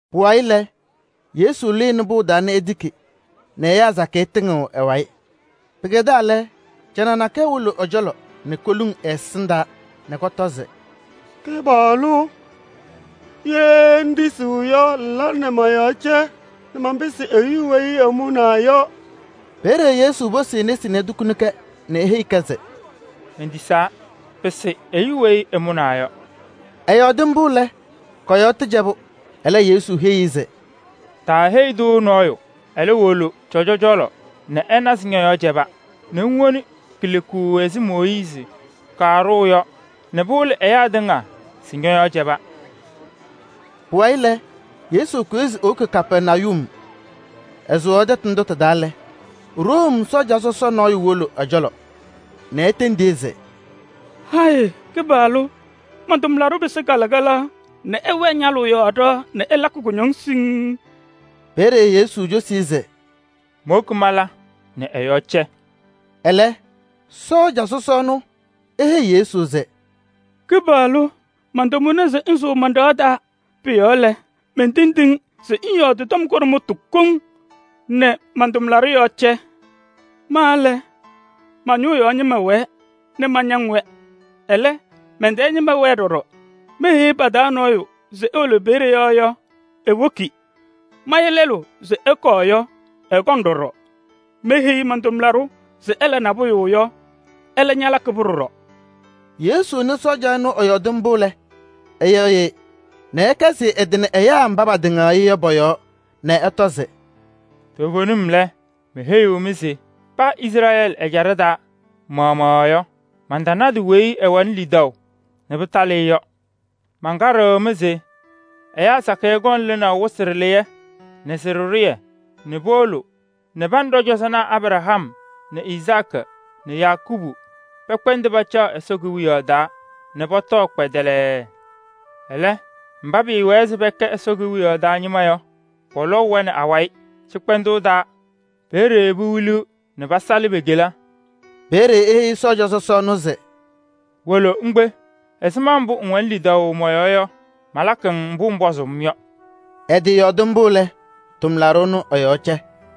Pʋwayɩ lɛ, Yesu lɩnɩ pʋʋ taa nɛ etiki nɛ ɛyaa sakɩyɛ tɩŋɩɣ ɛ-wayɩ. Pɩkɛdaa lɛ, canaɣ nakɛyɛ wolo ɛ-cɔlɔ nɛ koluŋ ɛ-ɛsɩndaa nɛ kɔtɔ se: “Kɩpaɣlʋ! Ye ŋtisiɣ yɔ, ŋla nɛ mɔ-yɔɔ cɛ nɛ manpɩsɩ ɛyʋ weyi ɛmʋnaa yɔ.” Peeye Yesu posi e-nesi nɛ etukuni-kɛ nɛ eheyi-kɛ se: “Mentisaa! Pɩsɩ ɛyʋ weyi ɛmʋnaa yɔ.” Ɛyɔɔdɩ mbʋ lɛ, kɔ-yɔɔ tɩcɛbʋ. Ɛlɛ Yesu heyi-i se: “Taaheyi-tʋ nɔɔyʋ. Ɛlɛ, wolo cɔjɔ cɔlɔ nɛ ɛna se ñɔ-yɔɔ cɛba, nɛ ŋwoni kileku ɛzɩ Mooyiizi kaɖʋʋ yɔ nɛ pɩwɩlɩ ɛyaa tɩŋa se ñɔ-yɔɔ cɛba.” Pʋwayɩ lɛ, Yesu kʋyɩ se ewoki Kapɛrnayum. Ɛsʋwaɣ tɛtʋ ndʋ tɩ-taa lɛ, Room sɔɔja sɔsɔ nɔɔyʋ wolo ɛ-cɔlɔ nɛ etendi-i se: “Hayɩ Kɩpaɣlʋ! Man-tʋmlaɖʋ pɩsɩ kalɩkalaɣ nɛ ɛwɛɛ ñalʋʋ yɔɔ ɖɩɣa nɛ ɛlakɩ kʋñɔŋ siŋŋ.” Peeye Yesu cosi-i se: “Mowoki mala nɛ ɛ-yɔɔ cɛ.” Ɛlɛ, sɔɔja sɔsɔ ɛnʋ eheyi Yesu se: “Kɩpaɣlʋ! Mantamʋna se ŋsʋʋ man-ɖɩɣa taa. Pʋ-yɔɔ lɛ, mentendiɣ-ŋ se ŋyɔɔdɩ tɔm kʋɖʋmtʋ koŋ nɛ man-tʋmlaɖʋ yɔɔ cɛ. Ma lɛ, ma-ñʋʋ yɔɔ ñɩma wɛɛ nɛ mañaŋ-wɛ. Ɛlɛ, mɛn-tɛɛ ñɩma wɛɛ ɖɔɖɔ. Meheyi pa-taa nɔɔyʋ se ewolo peeye yɔ yɔ, ewoki. Maya lɛlʋ se ɛkɔɔ yɔ, ɛkɔŋ ɖɔɖɔ. Meheyi man-tʋmlaɖʋ se ɛla nabʋyʋ yɔ, ɛlɛ ñalakɩ-pʋ ɖɔɖɔ.” Yesu nɩ sɔɔja ɛnʋ ɛyɔɔdɩ mbʋ lɛ, ɛyɩɣyɩ-ɩ nɛ ɛkɛzɩ ɛ-tɩ nɛ ɛyaa mba patɩŋaɣ-ɩ yɔ pɔ-yɔɔ nɛ ɛtɔ se: “Toovenim lɛ, meheyiɣ-mɩ se paa Izrɛɛlɩ ɛjaɖɛ taa maɣmaɣ yɔ, mantanadɩ weyi ɛwɛnɩ lidaʋ nɛ pɩtalɩ-ɩ yɔ. Mankaɖɩɣ-mɩ se ɛyaa sakɩyɛ kɔŋ lɩnaʋ wɩsɩ ɖɩlɩyɛ nɛ sɩ-ɖɩɖʋyɛ nɛ powolo pa nɛ ɖɔ-cɔzɔnaa Abraham nɛ Izaakɩ nɛ Yakɔɔbʋ pɛkpɛndɩ pacaɣ Ɛsɔ Kewiyaɣ taa nɛ pɔtɔkɩ kpɛdɛlɛɛ. Ɛlɛ, mba pɩɩwɛɛ se pɛkɛ Ɛsɔ Kewiyaɣ taa ñɩma yɔ, pɔlɔʋ-wɛ nɛ awayɩ cɩkpɛndʋʋ taa. Peeye pewiliɣ nɛ pasalɩ pe-kela.” Peeye eheyi sɔɔja sɔsɔ ɛnʋ se: “Wolo ŋkpe. Ɛzɩma mbʋ ŋwɛnɩ lidaʋ mɔ-yɔɔ yɔ, malakɩ-ŋ mbʋ ŋpɔzɩ-m yɔ.” Ɛtɩyɔɔdɩ mbʋ lɛ, tʋmlaɖʋ ɛnʋ ɛ-yɔɔ cɛ.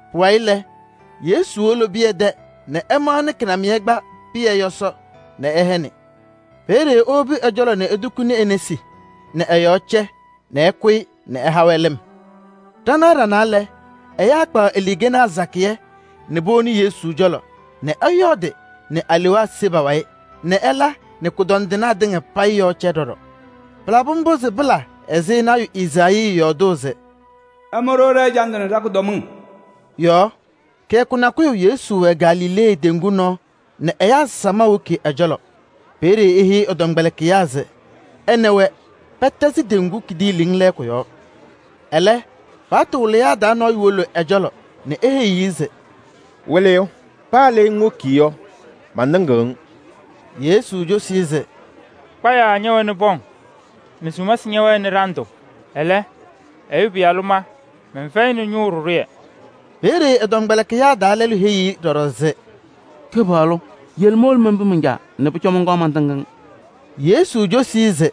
Pʋwayɩ lɛ, Yesu wolo Pɩyɛ tɛ nɛ ɛmaɣnɩ kɩnamɩyɛ kpa Pɩyɛ yɔsɔ nɛ ɛhɛnɩ. Peeye ewobi ɛ-cɔlɔ nɛ etukuni e-nesi nɛ ɛ-yɔɔ cɛ nɛ ɛkʋyɩ ɛha-wɛ lɩm. Ɖanaɣ ɖanaa lɛ, ɛyaa kpaɣ aluukenaa sakɩyɛ nɛ powoni Yesu cɔlɔ nɛ ɛyɔɔdɩ nɛ alewaa se pa-wayɩ nɛ ɛla nɛ kʋdɔndɩnaa tɩŋa payɩ yɔɔ cɛ ɖɔɖɔ. Pʋnɛ yɔ, pɩlabɩ mbʋ se pɩla ɛzɩ lɔɔyaɣ tʋ Ezaayii yɔɔdʋʋ se: “Ɛmʋ-ɖʋ ɖɛ-ɛjandʋ nɛ ɖa-kʋdɔmɩŋ” yɔ. Kɩyakʋ nakʋyʋ Yesu wɛ Galilee teŋgu nɔɔ nɛ ɛyaa samaɣ woki ɛ-cɔlɔ. Peeye eheyi ɛ-tɔmkpɛlɩkɩyaa se ɛ nɛ wɛ pɛtɛzɩ teŋgu kidiiliŋ lɛɛkʋ yɔɔ. Ɛlɛ, paɣtʋ wɩlɩyaa taa nɔɔyʋ wolo ɛ-cɔlɔ nɛ eheyiɣ-i se: “Wɩlɩyʋ! Paa le ŋwoki yɔ, mantɩŋɩɣ-ŋ.” Yesu cosi-i se: “Putanaa ñɛwɛnɩ pɔŋ nɛ sumasɩ ñɛwɛnɩ ɖandʋ. Ɛlɛ, Ɛyʋ Pɩyalʋ ma mɛnfɛyɩnɩ ñʋʋ ɖɩɖʋyɛ.” Peeye ɛ-tɔmkpɛlɩkɩyaa taa lɛlʋ heyi-i ɖɔɖɔ se: “Kɩpaɣlʋ! Yele mowolo menpi man-caa nɛ pʋcɔ mɔnkɔɔ mantɩŋ-ŋ.” Yesu cosi-i se: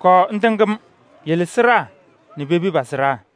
“Kɔɔ ŋtɩŋ-m, yele sɩɖaa nɛ pepi pa-sɩɖaa.”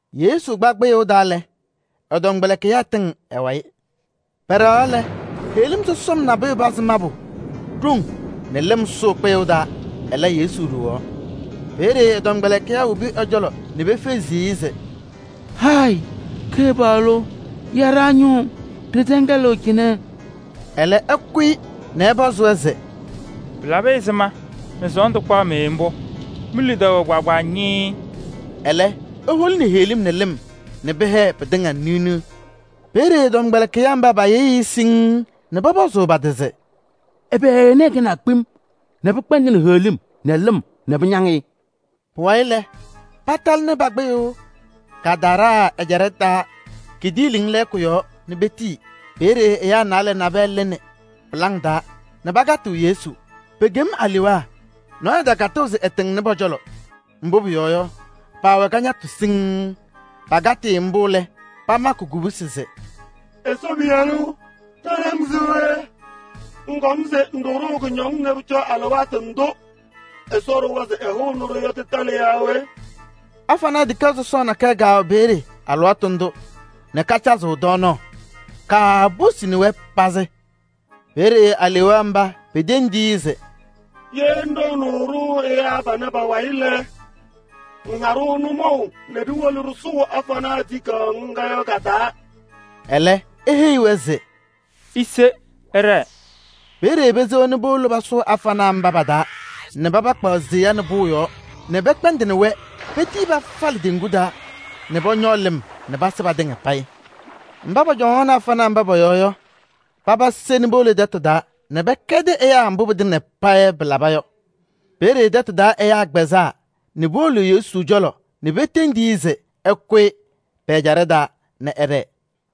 Yesu kpa kpɩyʋʋ taa lɛ, ɛ-tɔmkpɛlɩkɩyaa tɩŋ ɛ-wayɩ. Pɛɖɛɣaɣ lɛ, heɣlim sɔsɔm nabʋyʋ pazɩ mabʋ ɖoŋ nɛ lɩm sʋʋ kpɩyʋʋ taa. Ɛlɛ, Yesu ɖowaɣ. Peeye ɛ-tɔmkpɛlɩkɩyaa wobi ɛ-cɔlɔ nɛ pefezi-i se: “Hayɩ Kɩpaɣlʋ! Ya ɖa-ñʋʋ! Ɖɩtɛŋɛlɩɣ cɩnɛ!” Ɛlɛ, ɛkʋyɩ nɛ ɛpɔzɩ-wɛ se: “Pɩlabɩ ɛzɩma nɛ sɔɔndʋ kpaɣ-mɩ mbʋ? Mi-lidaʋ wɛ kpaagbaa ñɩɩɩ!” Ɛlɛ eholini heɣlim nɛ lɩm nɛ pɩhɛɛ pɩtɩŋa niɣ niɣ. Peeye ɛ-tɔmkpɛlɩkɩyaa mba payɩɣyɩ-ɩ siŋŋ nɛ pɔpɔzʋʋ pa-tɩ se: “Ɛbɛ ɛnɛ ɛkɛnaa kpem nɛ pɩkpɛndɩnɩ heɣlim nɛ lɩm nɛ pañaŋ-ɩ?” Pʋwayɩ lɛ, patalɩnɩ pa-kpɩyʋʋ Gadaraa ɛjaɖɛ taa kidiiliŋ lɛɛkʋ yɔɔ nɛ petii. Peeye ɛyaa naalɛ nabɛyɛ lɩnɩ pɩlaŋ taa nɛ pakatɩɣ Yesu. Pekem alewaa. Nɔɔyʋ takatɩɣ se ɛtɩŋnɩ pɔ-cɔlɔ, mbʋ pʋyɔɔ yɔ, paawɛ kañatʋ siŋŋ. Pakatɩ-ɩ mbʋ lɛ, pamakɩ kubusi se: “Ɛsɔ Pɩyalʋ! Ɖa nɛ ŋ se we? Ŋkɔm se ŋɖʋ-ɖʋ kʋñɔŋ nɛ pʋcɔ alɩwaatʋ ndʋ Ɛsɔ ɖʋwa se ɛhʋʋnɩ-ɖʋ yɔ tɩtalɩ yaa we?” Afanaa tikaɣ sɔsɔɔ nakɛyɛ kɛwɛ peeye alɩwaatʋ ndʋ nɛ kacazɩɣ tɔɔnaɣ. Kaaposini-wɛ pazɩ. Peeye alewaa mba petendi-i se: “Ye ŋɖɔɔnʋʋ-ɖʋ ɛyaa panɛ pa-wayɩ lɛ, ŋha-ɖʋ nʋmɔʋ nɛ ɖiwolo ɖɩsʋʋ afanaa tikaɣ ŋga yɔ ka-taa.” Ɛlɛ eheyi-wɛ se: “Ise ɩɖɛɛ!” Peeye pesewa nɛ powolo pasʋʋ afanaa mba pa-taa nɛ paba kpaɣ seya nɛ pʋʋ yɔɔ nɛ pɛkpɛndɩnɩ-wɛ petii pafalɩ teŋgu taa nɛ pɔñɔɔ lɩm nɛ pasɩ patɩŋa payɩ. Mba pɔcɔŋaɣnɩ afanaa mba pɔ-yɔɔ yɔ, paba se nɛ powolo tɛtʋ taa nɛ pɛkɛdɩ ɛyaa mbʋ pɩtɩŋa payɩ pɩlaba yɔ. Peeye tɛtʋ taa ɛyaa kpɛzaa nɛ powolo Yesu cɔlɔ nɛ petendiɣ-i se ɛkʋyɩ pɛ-ɛjaɖɛ taa nɛ ɛɖɛɛ.